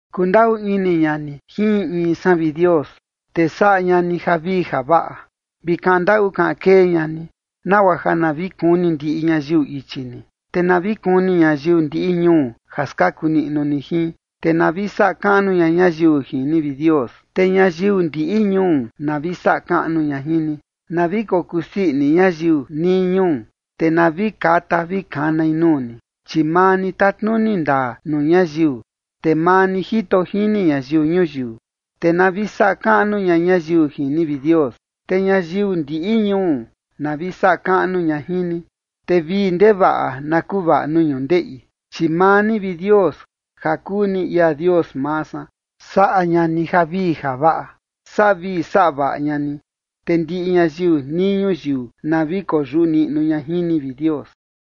Kundaꞌu ini ña ni jin in in san, vi Dios, te saꞌa ña ni javii javaꞌa, vi kaꞌan ndaꞌu kaꞌan kee ña ni, nagua ja na vi kuni ndiꞌi ñayiu ichi ni, te na vi kuni ñayiu ndiꞌi ñuu ja skaku niꞌnu ni jin. Te na vi saꞌa kaꞌnu ña ñayiu jin ni, vi Dios. Te ñayiu ndiꞌi ñuu na vi saꞌa kaꞌnu ña jin ni. Na vi kokuu sii ini ñayiu nii ñuu, te na vi kata vi kanai nuu ni, chi maa ni tatnuni ndaa nuu ñayiu, te maa ni jito jini ñayiu ñuyiu. Te na vi saꞌa kaꞌnu ña ñayiu jin ni, vi Dios. Te ñayiu ndiꞌi ñuu na vi saꞌa kaꞌnu ña jin ni. Te vii ndevaꞌa na kuvaꞌa nuu ñundeꞌi, chi maa ni, vi Dios, ja kuu ni ia Dios maa san, saꞌa ña ni javii javaꞌa. Saꞌa vii saꞌa vaꞌa ña ni, te ndiꞌi ñayiu nii ñuyiu na vi koyuꞌu niꞌnu ña jin ni, vi Dios.